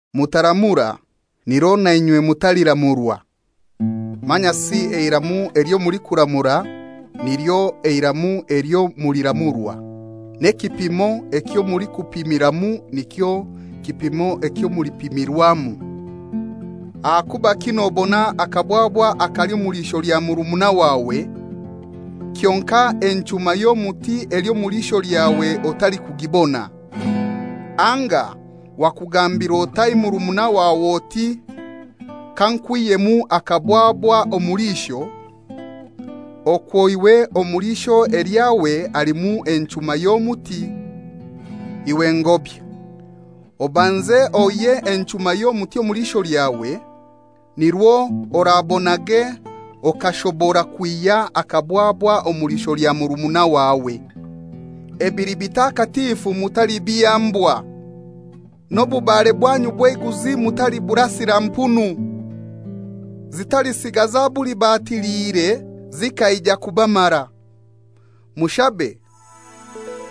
«Mutaramura, nirwo na inywe mutaliramurwa. Manyasi eiramu elyo mulikuramura nilyo iramu elyo muliramurwa. N'ekipimo ekyo mulikupimamu nikyo kipimo ekyo mulipimamu. Ahakubaki nobona akabwabwa akali omu liisho lya murumuna wawe, kyonkai enchuma y'omuti eli omu liisho lyawe otalikugibona? Anga wakugambira otai murumuna wawe oti, ‹Kankwihyemu akabwabwa omu liisho,› okwo iwe omu liisho elyawe halimu enchuma y'omuti? Iwe ngobya, obanze oihye enchuma y'omuti omu liisho lyawe, nirwo orabonage okashobora kwihya akabwabwa omu liisho lya murumuna wawe. Ebili bitakatifu mutalibiha mbwa. N'obubare bwanyu bw'eiguzi mutaliburasira mpunu, zitalisiga zabulibatiliire zikaija kubamara.» «Mushabe,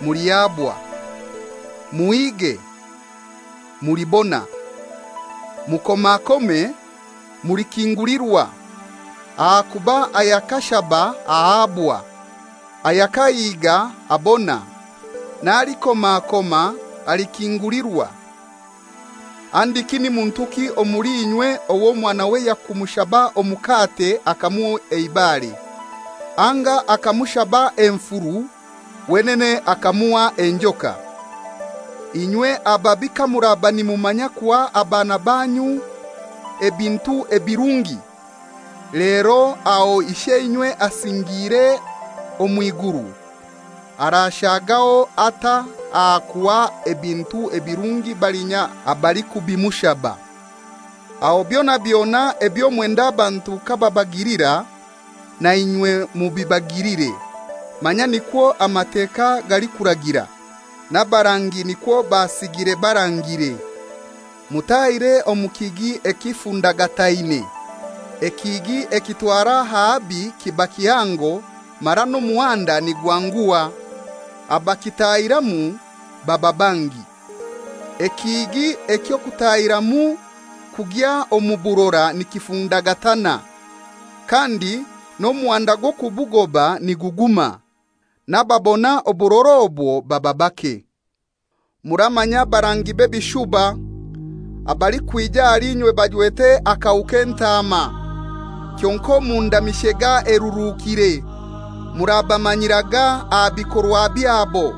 mulihabwa; muhige, mulibona; mukomakome, mulikingulirwa. Ahakuba ayakashaba ahabwa; ayakahiga abona, n'alikomakoma alikingulirwa. Handiki ni muntuki omuli inywe ow'omwanawe yakumushaba omukate akamuha eibare? Anga akamushaba enfuru, wenene akamuha enjoka? Inywe ababi kamuraba nimumanya kuha abaana banyu ebintu ebirungi, lero aho Isheinywe asingiire omw'iguru arashagaho atai aha kuha ebintu ebirungi balinya abalikubimushaba! Aho byona byona ebyo mwenda abantu kababagilira, na inywe mubibagilire; manya nikwo Amateka galikuragira, n'abarangi nikwo basigire barangire.» «Mutahire omu kihigi ekifundagataine. Ekihigi ekitwara ahabi kiba kihango mara n'omuhanda nigwanguha. Abakitaahiramu baba bangi. Ekihigi eky'okutaahiramu kugya omu burora nikifundagatana, kandi n'omuhanda gw'okubugoba niguguma. N'ababona oburora obwo baba bake.» «Muramanya abarangi b'ebishuba, abalikwija ahali inywe bajwete akahu k'entaama, kyonkai omunda mishega eruruukire. Murabamanyiraga aha bikorwa byabo.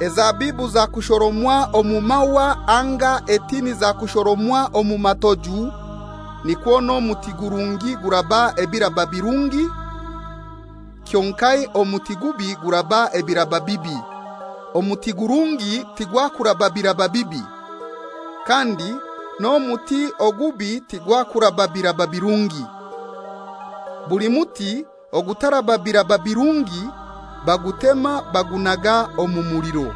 Ezabibu zakushoromwa omu mahwa anga etini zakushoromwa omu matoju? Nikwo n'omuti gurungi guraba ebiraba birungi, kyonkai omuti gubi guraba ebiraba bibi. Omuti gurungi tigwakuraba biraba bibi, kandi n'omuti ogubi tigwakuraba biraba birungi. Buli muti ogutaraba biraba birungi bagutema bagunaga omu muliro.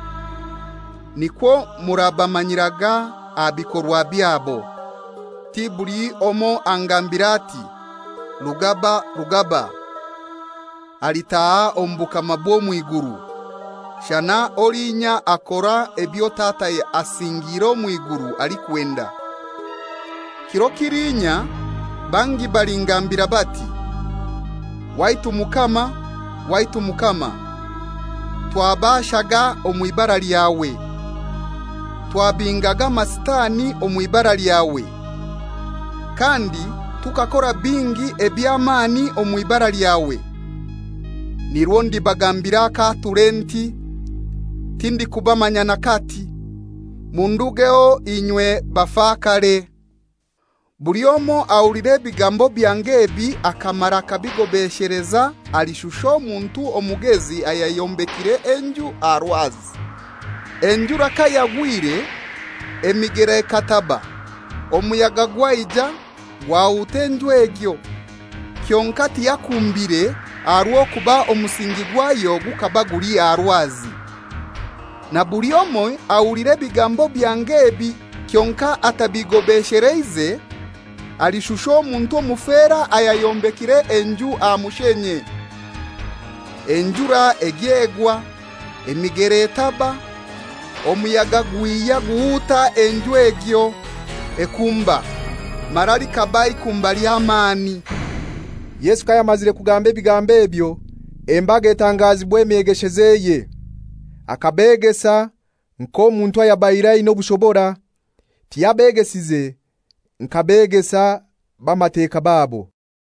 Nikwo murabamanyiraga aha bikorwa byabo.» «Ti buli omoi angambira ati, ‹Rugaba, Rugaba,› alitaaha mu bukama bwa mw'iguru, shana olinya akora ebyo Tata asingiire omw'iguru alikwenda. Kiro kiliinya bangi balingambira bati, ‹Waitu Mukama, Waitu Mukama, twabashaga omw'ibara lyawe, twabingaga amasitani omw'ibara lyawe, kandi tukakora bingi eby'amani omw'ibara lyawe.› Nirwo ndibagambira akaature nti, ‹Tindikubamanya n'akati; mundugeho inywe bafakare.›» «Buli omoi ahulira ebigambo byange ebi akamara akabigobesheleza alishusha omuntu omugezi ayayombekire enju aha rwazi. Enjura kayagwire, emigera ekataba, omuyaga gwaija gwahuta enju egyo, kyonkai tiyakumbire aha rw'okuba omusingi gwayo gukaba guli aha rwazi. Na buli omoi ahulira ebigambo byange ebi kyonkai atabigobesheleize, alishusha omuntu omufera ayayombekire enju aha mushenye. Enjura egya egwa, emigera etaba, omuyaga gwihya guhuta enju egyo ekumba, mara likaba ikumba ly'amani.» Yesu kayamazire kugamba ebigambo ebyo, embaga etangazibwa emyegeshezeye. Akabegesa nk'omuntu ayabaire aina obushobora, tiyabeegesize nka begesa b'Amateka babo.